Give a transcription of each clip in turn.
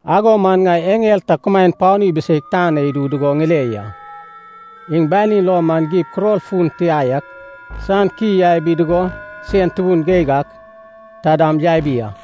Ago man ŋai eŋel ta kumaen panu ibiseig tan na idu dugo ŋile ya. Iŋ banin lo man gib kuror fun tia yak san ki yabi dugo sein tubun geig ak ta dam yabi a.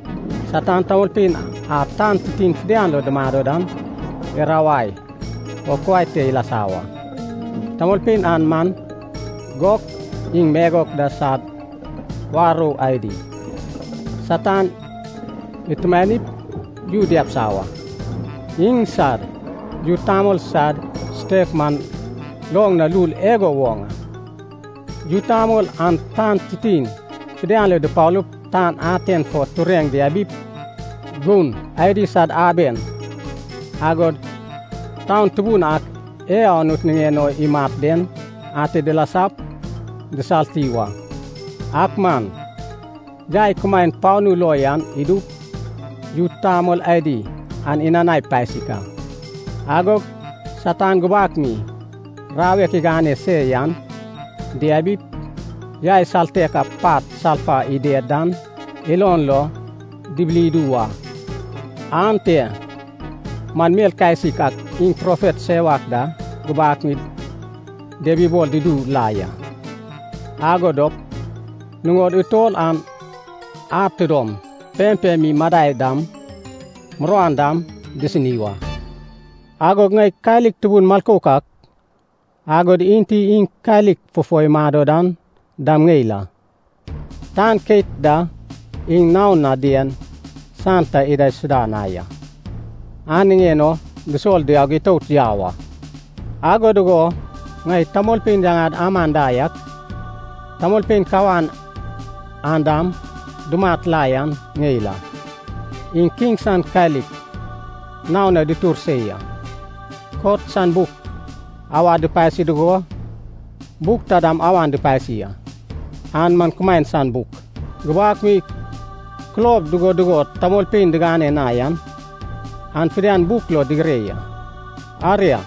Satan tamolpein a tan titin fidian lo dumado dan irawai o kuai te ilasa wa. Tamolpein an man Gok iŋ Magok da sad warou adi. Satan itumanaip yu diabisa wa. Iŋsad yu tamol sad sutek man loŋ na lul igo woŋ a. Yu tamol an tan titin fidian lo dupalup tan aten fo tureŋ diabip, gun adi sad aben agod taun tubun ak e Anut niŋen o imat den ate dilasap disalti wa. Ak man, yai kumaen panu lo yan idup, yu tamol adi an inanai pasik a. Agog Satan gubak mi rawek igane se yan diabip, yai saltek a pat salfa ided dan ilon lo dibili idu wa. Ante man mel kasik ak iŋ profet sewak da gubak mi diabibol dudu la ya. Ago dop nuŋod utol an ad tidom pempem mi madai dam muruan dam disini wa. Agog ŋai kalik tubun milkouk ak, agod Enti iŋ kalik fufo imado dan dam ŋeil a. Tan keit da iŋ naon na dien san ta idaisuda na ya, an niŋen o dusol diaug itout yau a. Ago dugo ŋai tamolpein yaŋad aman da yak, tamolpein kawan a dam dumat la yan ŋeil a. Iŋ kiŋ san kalik naon na dutur se ya. Kot san buk awad dupasi dugo, buk taidam awan dupasi a. An man kumaen san buk. Gubak mi kulob dugo dugo tamolpein digane na yan, an fidian buk lo digire ya. Aria,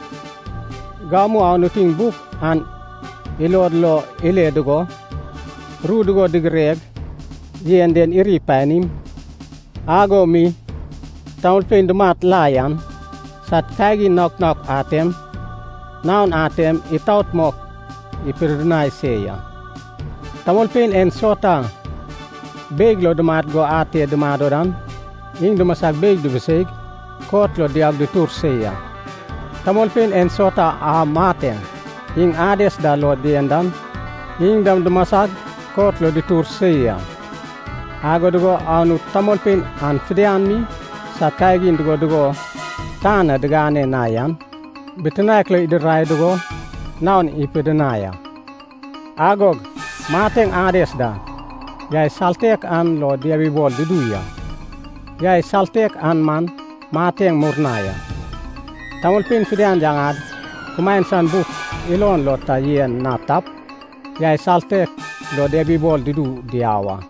gamu Anut iŋ buk an ilod lo ile dugo, ru dugo digireg yen den iri panim, ago mi tamolpein dumat la yan sad kagin naok naok atem, naon atem itaot mok ipidinai se ya. Tamolpein ensauta beig lo dumat go ate dumado dan, iŋ dumasag beig dubuseig kot lo diaug dutur se ya. Tamolpein ensauta a Mateŋ iŋ Ades da lo dien dan, iŋ dam dumasag kot lo dutur se ya. Ago dugo Anut tamolpein an fidian mi sad kagin dugo dugo tan na digane na yan bitinaek lo idirai dugo naon ipidinai a. Agog Mateŋ Ades da yai saltek an lo diabibol dudu ya. Yai saltek an man mateŋ murnai a. Tamolpein fidian yaŋad kumaen san buk ilon lo ta yen na tap, yai saltek lo diabibol dudu diau a.